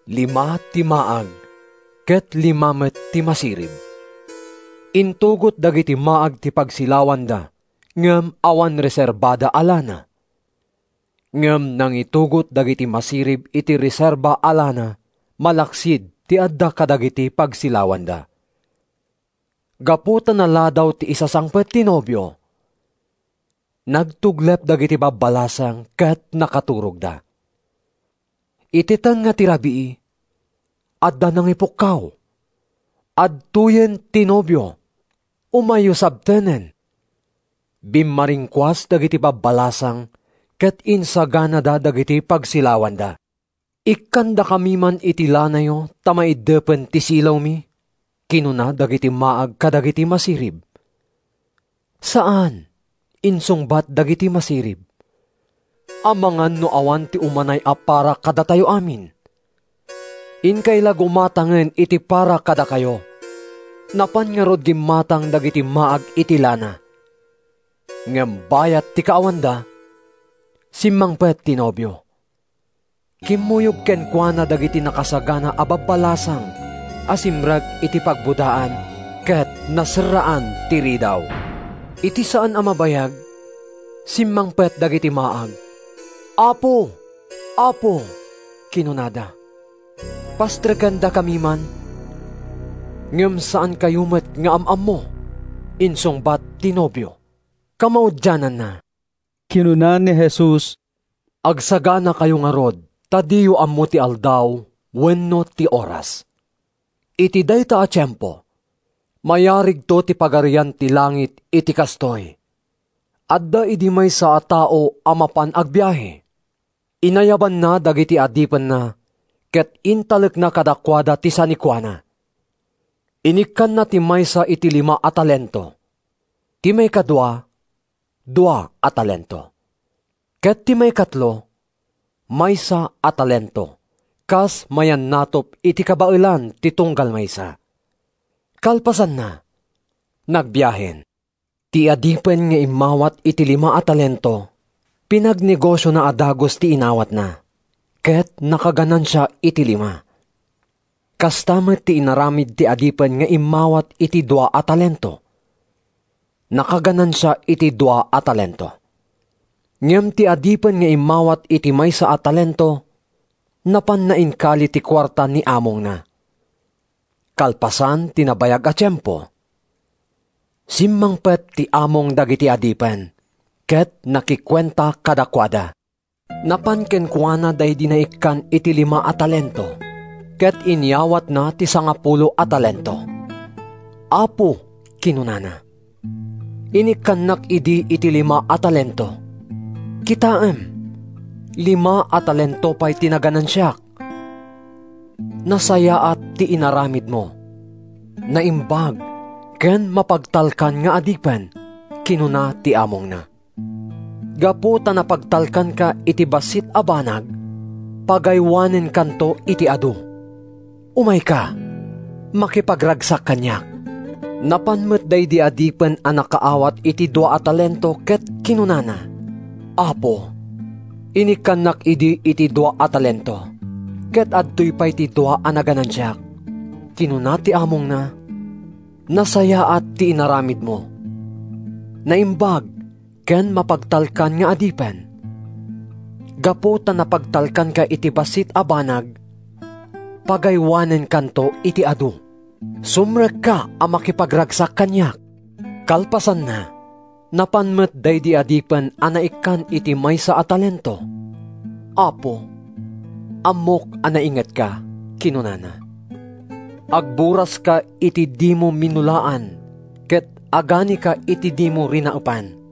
Lima ti maag, ket lima met ti masirib. Intugot dagiti maag ti pagsilawanda ngem awan reserbada a lana. Ngem nangitugot dagiti masirib iti reserba a lana, malaksid ti adda kadagiti pagsilawanda. Gapu ta naladaw ti isasangpet ti nobio, nagtuglep dagiti babbalasang ket nakaturogda. “Iti tengnga ti rabii, adda nangipukkaw: ‘Adtoyen ti nobio! Umayyo sabtenen!’ “Bimmaringkuas dagiti babbalasang ket insaganada dagiti pagsilawanda. “‘Ikkandakam man iti lanayo ta maiddepen ti silawmi,’ kinuna dagiti maag kadagiti masirib. “‘Saan!’ insungbat dagiti masirib. ‘Amangan no awan ti umanay a para kadatayo amin. Inkay la gumatangen iti para kadakayo.’ “Napan ngarud gimmatang dagiti maag iti lana. Ngem bayat ti kaawanda, simmangpet ti nobio. Kimmuyog kenkuana dagiti nakasagana a babbalasang a simrek iti pagbodaan ket naserraan ti ridaw. “Iti saan a mabayag, simmangpet dagiti maag. ‘Apo, Apo!’ kinunada. ‘Pastrekendaka man.’ “ ‘Ngem saankayo met nga am-ammo!’ insungbat ti nobio.” Kamaudiananna, kinuna ni Jesus: “Agsaganakayo ngarud ta diyo ammo ti aldaw wenno ti oras.” “Iti dayta a tiempo, mayarigto ti Pagarian ti Langit iti kastoy: Adda idi maysa a tao a mapan agbiahe. Inayabanna dagiti adipenna ket intalekna kadakuada ti sanikuana. Inikkanna ti maysa iti lima a talento, ti maikadua, dua a talento, ket ti maikatlo, maysa a talento, kas mayannatup iti kabaelan ti tunggal maysa. Kalpasanna, nagbiahen. “Ti adipen nga immawat iti lima a talento pinagnegosiona a dagus ti inawatna, ket nakaganansia iti lima. Kasta met ti inaramid ti adipen nga immawat iti dua a talento. Nakaganansia iti dua a talento. Ngem ti adipen nga immawat iti maysa a talento napanna inkali ti kuarta ni amongna. “Kalpasan ti nabayag a tiempo, simmangpet ti among dagiti adipen ket nakikuenta kadakuada. Napan kenkuana daydi naikkan iti lima a talento ket inyawatna ti sangapulo a talento. ‘Apo,’ kinunana, ‘inikkannak idi iti lima a talento. Kitaem, lima a talento pay ti naganansiak.’ “‘Nasayaat ti inaramidmo, naimbag ken mapagtalkan nga adipen!’ kinuna ti amongna. ‘Gapu ta napagtalkanka iti bassit a banag, pagaywanenkanto iti adu. Umayka makipagragsak kaniak.’ “Napan met daydi adipen a nakaawat iti dua a talento ket kinunana, ‘Apo, inikkannak idi iti dua a talento ket adtoy pay ti dua a naganansiak.’ “Kinuna ti amongna, ‘Nasayaat ti inaramidmo, naimbag ken mapagtalkan nga adipen! Gapu ta napagtalkanka iti bassit a banag, pagaywanenkanto iti adu. Sumrekka a makipagragsak kaniak.’ “Kalpasanna, napan met daydi adipen a naikkan iti maysa a talento. ‘Apo, ammok a naingetka,’ kinunana. ‘Agburaska iti dimo minulaan ket aganika iti dimo rinaepan.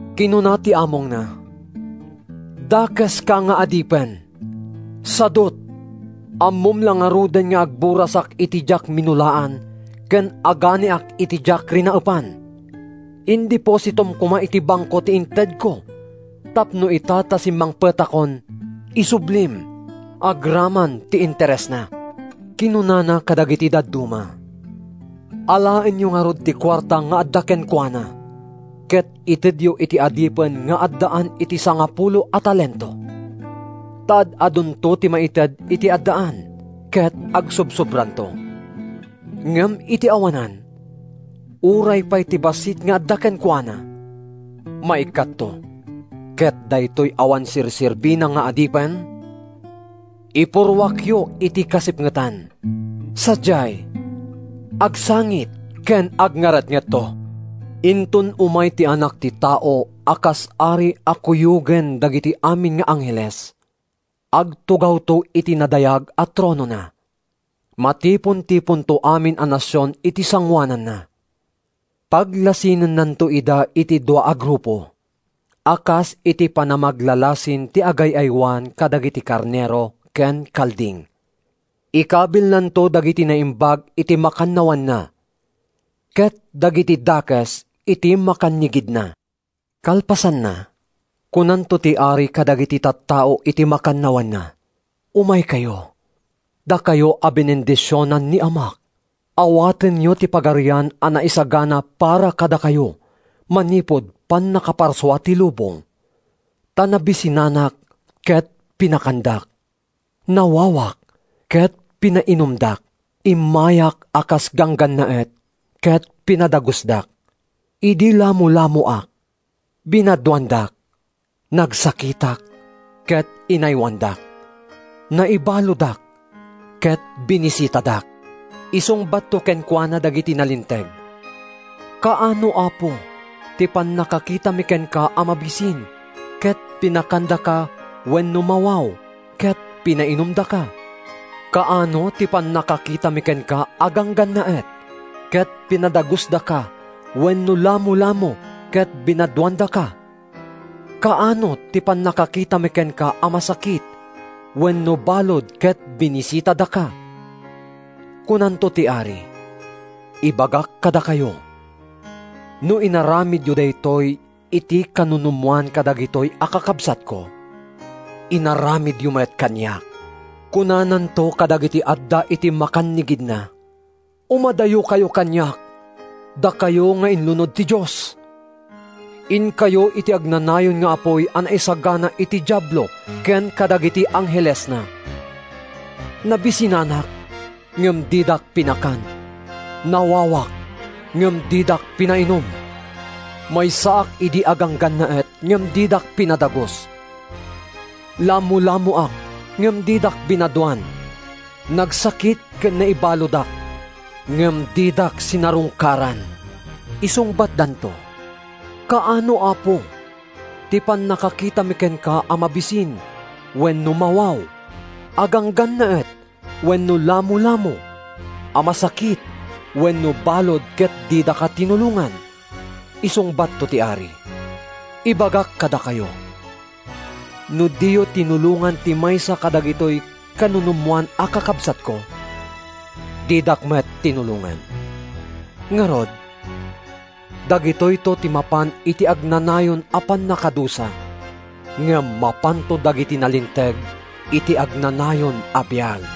“Kinuna ti amongna, ‘Dakeska nga adipen! Sadut! Ammom la ngaruden nga agburasak iti diak minulaan ken aganiak iti diak rinaepan. Indepositom koma iti bangko ti intedko tapno ita ta simmangpetakon, isublim agraman ti interesna.’ Kinunana kadagiti dadduma, ‘Alaenyo ngarud ti kuarta nga adda kenkuana ket itedyo iti adipen nga addaan iti sangapulo a talento. Ta ad-adunto ti maited iti addaan ket agsobsobraanto; ngem iti awanan, uray pay ti bassit nga adda kenkuana, maikkatto. Ket daytoy awan serserbina nga adipen, ipurruakyo iti kasipngetan. Sadiay, agsangit ken agngaretngetto.’” “Inton umay ti Anak ti Tao a kas Ari a kuyogen dagiti amin nga angheles, agtugawto iti nadayag a tronona. Matipontiponto amin a nasion iti sangoananna. Paglasinennanto ida iti dua a grupo a kas iti panamaglalasin ti agay-aywan kadagiti karnero ken kalding. Ikabilnanto dagiti naimbag iti makannawanna, ket dagiti dakes iti makannigidna. Kalpasanna, kunanto ti Ari kadagiti tattao iti makannawanna: ‘Umaykayo, dakayo a binendisionan ni Amak! Awatenyo ti pagarian a naisagana para kadakayo manipud pannakaparsua ti lubong. Ta nabisinanak ket pinakandak; nawawak ket pinainumdak; immayak a kas ganggannaet ket pinadagusdak. Idi lamolamoak, binadoandak; nagsakitak ket inaywanandak; naibaludak ket binisitadak.’ Isungbatto kenkuana dagiti nalinteg: ‘Kaano, Apo, ti pannakakitami kenka a mabisin ket pinakandaka wenno mawaw ket pinainumdaka? Kaano ti pannakakitami kenka a ganggannaet ket pinadagusdaka wenno lamolamo ket binadoandaka? Kaano ti pannakakitami kenka a masakit wenno balud ket binisitadaka?’ Kunanto ti Ari, ‘Ibagak kadakayo: no inaramidyo daytoy iti kanunumoan kadagitoy a kakabsatko, inaramidyo met kaniak!’ “Kunananto kadagiti adda iti makannigidna: ‘Umadayokayo kaniak, dakayo nga inlunod ti Dios! Inkayo iti agnanayon nga apuy a naisagana iti Diablo ken kadagiti anghelesna. Nabisinanak ngem didak pinakan; nawawak ngem didak pinainum; maysaak idi a ganggannaet ngem didak pinadagus; lamolamoak ngem didak binadoan; nagsakit ken naibaludak ngem didak sinarungkaran.’ Isungbatdanto: ‘Kaano, Apo, ti pannakakitami kenka a mabisin wenno mawaw, a ganggannaet wenno lamolamo, a masakit wenno balud ket didaka tinulongan?’ Isungbatto ti Ari, ‘Ibagak kadakayo: No diyo tinulongan ti maysa kadagitoy kanunumoan a kakabsatko, didak met tinulongan.’ Ngarud, dagitoyto ti mapan iti agnanayon a pannakadusa. Ngem mapanto dagiti nalinteg iti agnanayon a biag.”